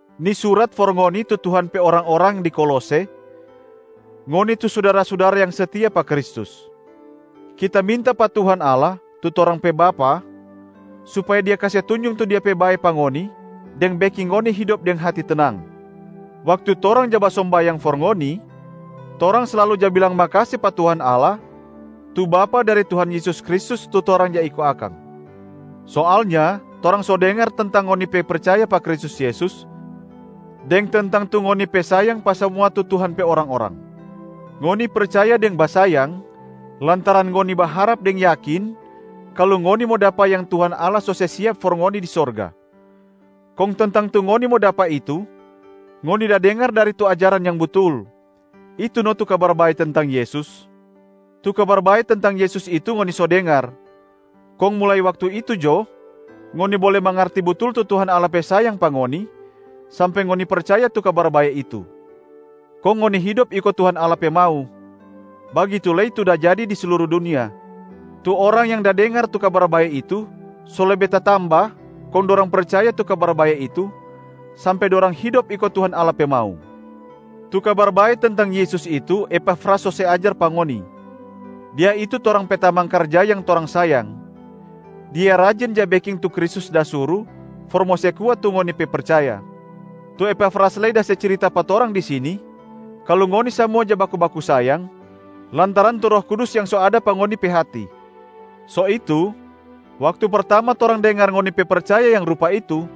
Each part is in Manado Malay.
Ni surat for ngoni tu Tuhan pe orang-orang di Kolose, ngoni tu sudara-sudara yang setia pa Kristus. Kita minta pa Tuhan Allah tu torang pe Bapa supaya Dia kase tunjung tu bae pa ngoni deng beking ngoni hidop deng hati tenang. Waktu torang ja basombayang for ngoni, torang slalu ja bilang makase pa Tuhan Allah, tu Bapa dari Tuhan Yesus Kristus tu torang ja iko akang. Soalnya torang so dengar tentang ngoni pe percaya pa Kristus Yesus deng tentang tu ngoni pe sayang pa samua tu Tuhan pe orang-orang. Ngoni percaya deng basayang lantaran ngoni baharap deng yakin kalu ngoni mo dapa yang Tuhan Allah so se siap for ngoni di sorga. Kong tentang tu ngoni mo dapa itu ngoni da dengar dari tu ajaran yang butul, itu no tu Kabar Bae tentang Yesus. Tu Kabar Bae tentang Yesus itu ngoni so dengar, kong mulai waktu itu jo ngoni bole mangarti butul tu Tuhan Allah pe sayang pa ngoni sampe ngoni percaya tu Kabar Bae itu, kong ngoni hidop iko Tuhan Allah pe mau. Bagitu lei tu da jadi di sluru dunia, tu orang yang da dengar tu Kabar Bae itu so lebe tatamba kong dorang percaya tu Kabar Bae itu sampe dorang hidop iko Tuhan Allah pe mau. Tu Kabar Bae tentang Yesus itu Epafras so se ajar pa ngoni. Dia itu torang pe tamang karja yang torang sayang. Dia rajin ja beking tu Kristus da suru for mo se kuat tu ngoni pe percaya. Tu Epafras lei da se cirita pa torang di sini kalu ngoni samua ja baku-baku sayang lantaran tu Roh Kudus yang so ada pa ngoni pe hati. So itu, waktu pertama torang dengar ngoni pe percaya yang rupa itu,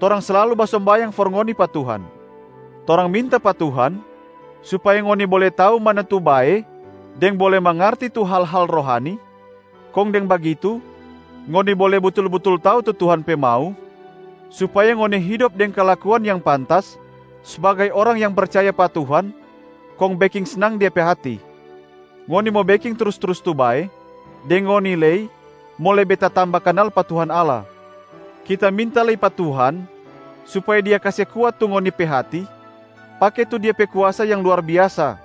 torang slalu basombayang for ngoni pa Tuhan. Torang minta pa Tuhan supaya ngoni bole tau mana tu bae deng bole mangarti tu hal-hal rohani, kong deng bagitu ngoni bole butul-butul tau tu Tuhan pe mau, supaya ngoni hidop deng kalakuan yang pantas sbagai orang yang percaya pa Tuhan kong beking snang Dia pe hati. Ngoni mo beking trus-trus tu bae, deng ngoni lei mo lebe tatamba kanal pa Tuhan Allah. Kita minta lei pa Tuhan supaya Dia kase kuat tu ngoni pe hati pake tu Dia pe kuasa yang luar biasa,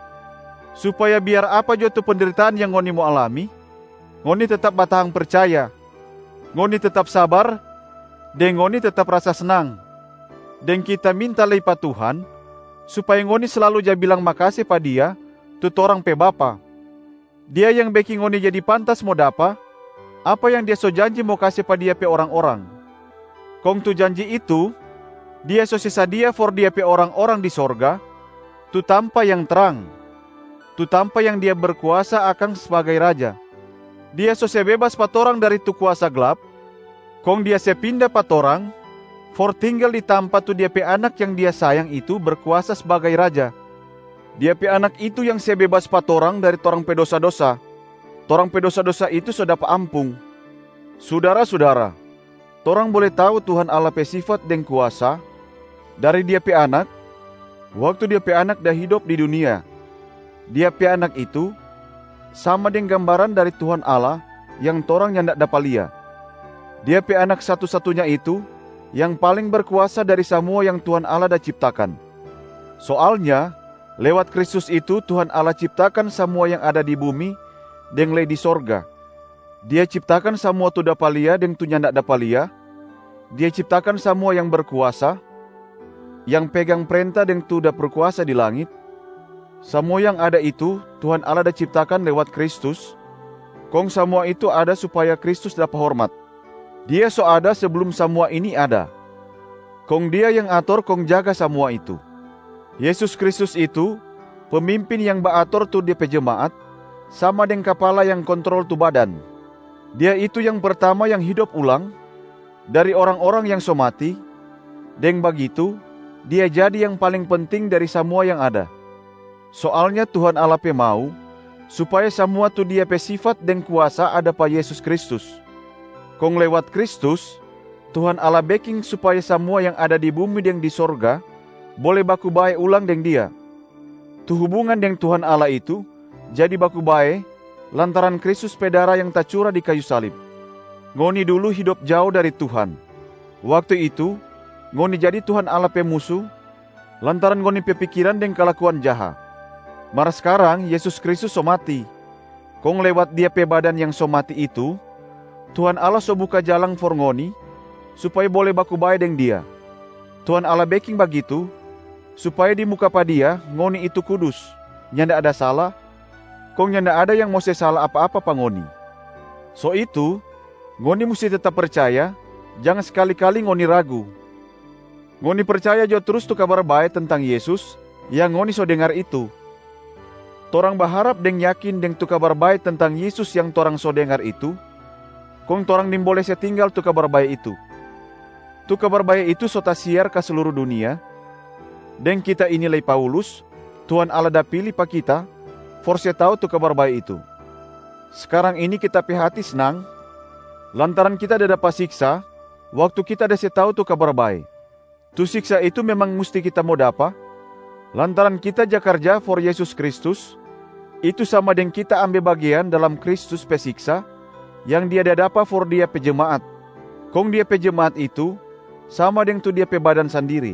supaya biar apa jo tu pendritaan yang ngoni mo alami ngoni tetap batahang percaya, ngoni tetap sabar deng ngoni tetap rasa snang. Deng kita minta lei pa Tuhan supaya ngoni slalu ja bilang makase pa Dia tu torang pe Bapa. Dia yang beking ngoni jadi pantas mo dapa apa yang Dia so janji mo kase pa Dia pe orang-orang. Kong tu janji itu Dia so se sadia for Dia pe orang-orang di sorga tu tampa yang trang, tu tampa yang Dia berkuasa akang sbagai Raja. Dia so se bebas pa torang dari tu kuasa glap, kong Dia se pinda pa torang for tinggal di tampa tu Dia pe Anak yang Dia sayang itu berkuasa sbagai Raja. Dia pe Anak itu yang se bebas pa torang dari torang pe dosa-dosa, torang pe dosa-dosa itu so dapa ampung. Sudara-sudara, torang bole tau Tuhan Allah pe sifat deng kuasa dari Dia pe Anak waktu Dia pe Anak da hidop di dunia, Dia pe Anak itu sama deng gambaran dari Tuhan Allah yang torang nyanda dapa lia. Dia pe Anak satu-satunya itu yang paling berkuasa dari samua yang Tuhan Allah da ciptakan. Soalnya lewat Kristus itu Tuhan Allah ciptakan samua yang ada di bumi deng lei di sorga. Dia ciptakan samua tu dapa lia deng tu nyanda dapa lia, Dia ciptakan samua yang berkuasa, yang pegang prenta deng tu da berkuasa di langit. Samua yang ada itu Tuhan Allah da ciptakan lewat Kristus, kong samua itu ada supaya Kristus dapa hormat. Dia so ada seblum samua ini ada, kong Dia yang ator kong jaga samua itu. Yesus Kristus itu pemimpin yang baator tu De pe jemaat, sama deng kapala yang kontrol tu badan. Dia itu yang pertama yang hidop ulang dari orang-orang yang so mati, deng bagitu Dia jadi yang paling penting dari samua yang ada. Soalnya Tuhan Allah pe mau supaya samua tu Dia pe sifat deng kuasa ada pa Yesus Kristus. Kong lewat Kristus, Tuhan Allah beking supaya samua yang ada di bumi deng di sorga bole baku bae ulang deng Dia. Tu hubungan deng Tuhan Allah itu jadi baku bae lantaran Kristus pe dara yang tacura di kayu salib. Ngoni dulu hidop jao dari Tuhan. Waktu itu ngoni jadi Tuhan Allah pe musu lantaran ngoni pe pikiran deng kalakuan jaha. Mar skarang Yesus Kristus so mati, kong lewat Dia pe badan yang so mati itu Tuhan Allah so buka jalang for ngoni supaya bole baku bae deng Dia. Tuhan Allah beking bagitu supaya di muka pa Dia ngoni itu kudus, nyanda ada sala, kong nyanda ada yang mo se sala apa-apa pa ngoni. So itu ngoni musti tetap percaya, jang skali-kali ngoni ragu. Ngoni percaya jo trus tu Kabar Bae tentang Yesus yang ngoni so dengar itu. Torang baharap deng yakin deng tu Kabar Bae tentang Yesus yang torang so dengar itu, kong torang nimbole se tinggal tu Kabar Bae itu. Tu Kabar bae itu so tasiar ka sluru dunia, deng kita ini lei Paulus, Tuhan Allah da pili pa kita for se tau tu Kabar Bae itu. Skarang ini kita pe hati snang lantaran kita da dapa siksa waktu kita da se tau tu Kabar Bae. Tu siksa itu memang musti kita mo dapa lantaran kita ja karja for Yesus Kristus, itu sama deng kita ambe bagean dalam Kristus pe siksa yang Dia da dapa for Dia pe jemaat, kong Dia pe jemaat itu sama deng tu Dia pe badan sandiri.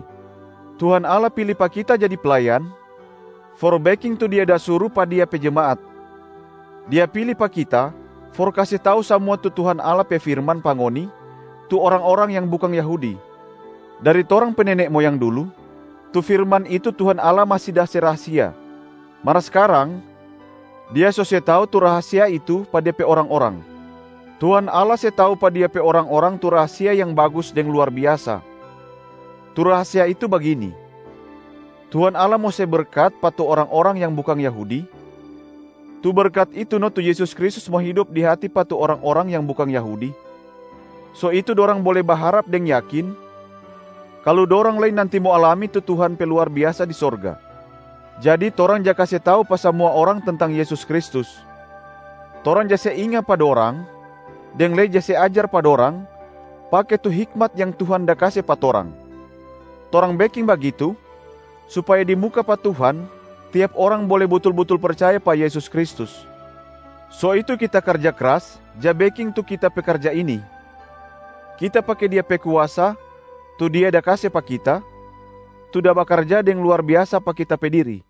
Tuhan Allah pili pa kita jadi playan for beking tu Dia da suru pa Dia pe jemaat. Dia pili pa kita for kase tau samua tu Tuhan Allah pe firman pa ngoni tu orang-orang yang bukang Yahudi. Dari torang pe nene moyang dulu tu firman itu Tuhan Allah masi da se rahasia, mar skarang Dia so se tau tu rahasia itu pa De pe orang-orang. Tuhan Allah se tau pa Dia pe orang-orang tu rahasia yang bagus deng luar biasa. Tu rahasia itu bagini: Tuhan Allah mo se berkat pa tu orang-orang yang bukang Yahudi, tu berkat itu no tu Yesus Kristus mo hidop di hati pa tu orang-orang yang bukang Yahudi. So itu dorang bole baharap deng yakin kalu dorang lei nanti mo alami tu Tuhan pe luar biasa di sorga. Jadi torang ja kase tau pa samua orang tentang Yesus Kristus. Torang ja se inga pa dorang deng lei ja se ajar pa dorang, pake tu hikmat yang Tuhan da kase pa torang. Torang beking bagitu, supaya di muka pa Tuhan tiap orang bole butul-butul percaya pa Yesus Kristus. So itu kita karja kras ja beking tu kita pe karja ini. Kita pake Dia pe kuasa tu Dia da kase pa kita, tu da bakarja deng luar biasa pa kita pe diri.